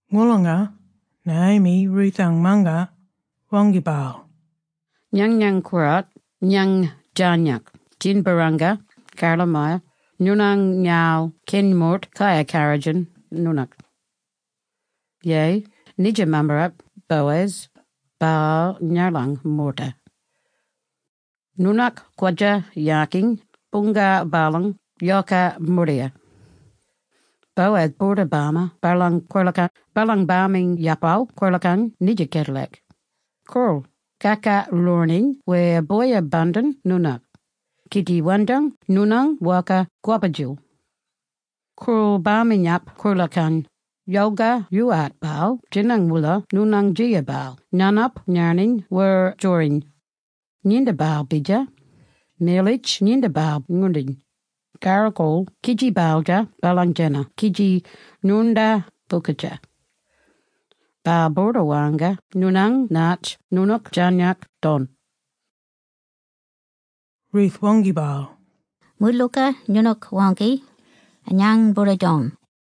Ngolonga, Naomi, Ruth-ang mangat, waangki baal, “Nganyang koowart, ngany djarnyak djin-barranga karla-maya noonang ngarl keny moort kayar karrodjin noonany. Yeyi, nidja mammarap, Boaz, baal ngalang moorta. Noonook kwadja-yakiny boongal baalang yoka mordiya. Boaz boorda bama baalang kwolaka baalang baminyapal kwolakang nidja kedalak. Koorl, kakaloorni wer boyin-bandin noonaal, kidji wandang noonang bwoka kwabba-djil. Koorl baminyap-kwolakang, yalga yoowart baal djinang-oola noonany djiya baal nganop ngarniny wer djoriny. Nginda baal bidjar, miyalitj nginda baal ngwoorndiny, karro koorl kidji baldjar baalang djena kidji ngwoornda bookadja. Baal boorda warranga noonany natj noonook djarnyak don.” Ruth waangki baal, “Moodlooka noonook waangki, ngany boorda-don.”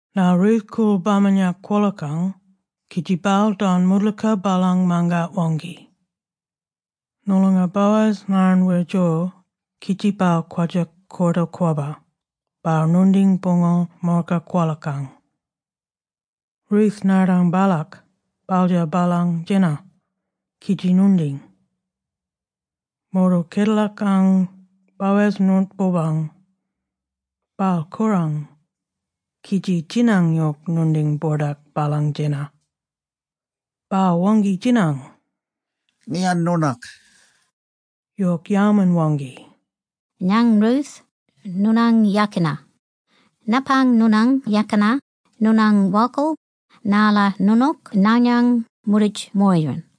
Ngarl Ruth koorl baminyap-kwolakang kidji baal don moodlooka baalang mangat waangki. Ngolonga Baoz ngarn wer djor, kidji baal kwadja koorta-kwobb, baal ngwoorndiny boongal moorka kwolakang. Ruth ngardang baalak, baldjar baalang djena, kidji ngwoorndiny. Moordal kedelakang, Boaz ngoont-boorbang. Baal korang, kidji djinang yok ngwoorndiny bordak baalang djena. Baal waangki-djinang, “Ngiyan noonook?” Yok yalman-waangki, “Ngany Ruth, noonang yakina. Napang noonang yakina noonang bwokal narla noonook nganyang moorditj-moyiran.”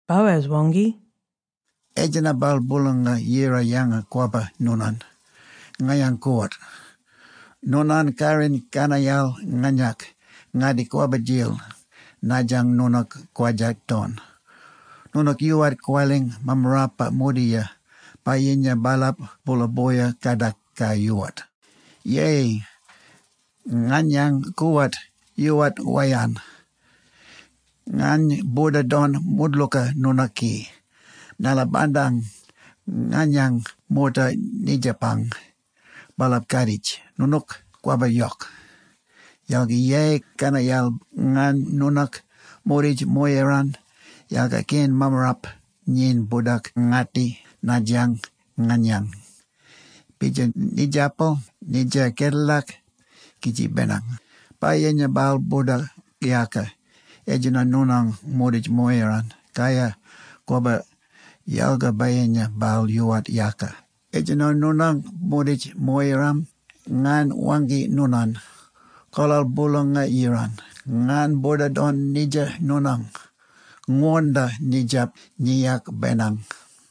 Boaz waangki, “Etjenna-bal Boolanga-Yira yanga-kwabba noonany, nganyang koowart. Noonang karriny karnayal nganyak, ngatti kwabba-djil naadjang noonook kwadjat-don. Noonook yoowart ngwaling mammarapa mordiya, bayinya baalap boola-boya kadak ka yoowart. Yeyi, nganyang koowart, yoowart wayarn. Ngany boorda don moodlooka noonook ki, narla bandang nganyang moorta nidjapang, baalap kaditj noonook kwabba yok. Yalga yeyi, karnayal, ngany noonang moorditj-moyiran, yalga keny mammarap nyin boordak-ngatti naatjang nganyany. Bidjar nidjapal nidja kedelak, kidji benang, bayinya baal boorda yaaka etjenno noonang moorditj-moyiran, kaya, kwabba, yalga bayinya baal yoowart yaaka etjenno noonang moorditj-moyiran, ngany waangki noonany, kolal Boolanga-Yirang, ngany boorda don nidja noonang. Ngwoornda nitjap djiyak benang.”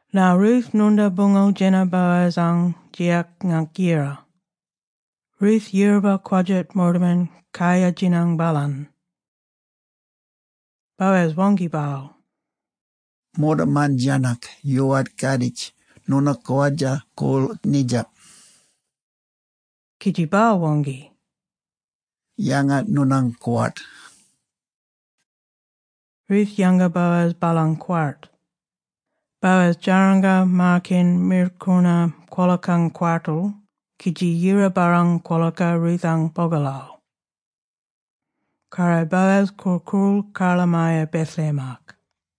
Ngarl Ruth ngwoornda boongal djena Boaz-ang djiyak ngaank yira. Ruth yiraba kwadjat moortaman kayar-djinang baalany. Boaz waangki baal, “Moortaman djarnyak yoowart kaaditj noonook kwadja-koorl nidjap.” Kidji baal waangki, “Yanga noonang kwart.” Ruth yanga Boaz baalang kwart. Boaz djaranga maar-keny mirlkoona kwolakang kwartal, kidji yira-barrang kwolaka Ruth-ang bogalal. Karro Boaz korl-koorl karlamaya Bethlehem-ak.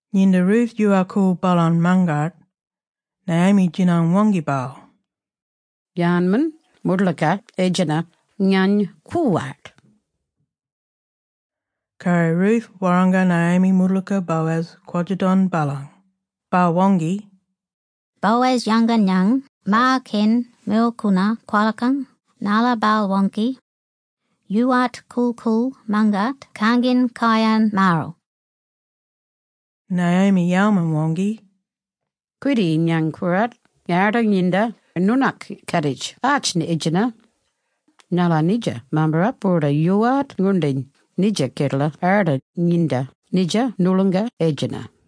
Nginda Ruth yoowarl-koorl baalang mangat, Naomi djinang-waangki baal, “Yarnmen moodlooka etjenna, ngany koowart?” Karro Ruth warranga Naomi moodlooka Boaz kwadja-don baalang. Baal waangki, “Boaz yanga ngany maar-keny mirlkoona kwolakang, narla baal waangki, ‘Yoowart korl-koorl mangat kanginy kayan maaral’.” Naomi yalman-waangki, “Kwidi, ngany koowart, arda nginda noonook kaditj naatj etjenna, narla nidja mammarap boorda yoowart ngwoorndiny nidja kedela arda nginda nidja noolonga etjenna.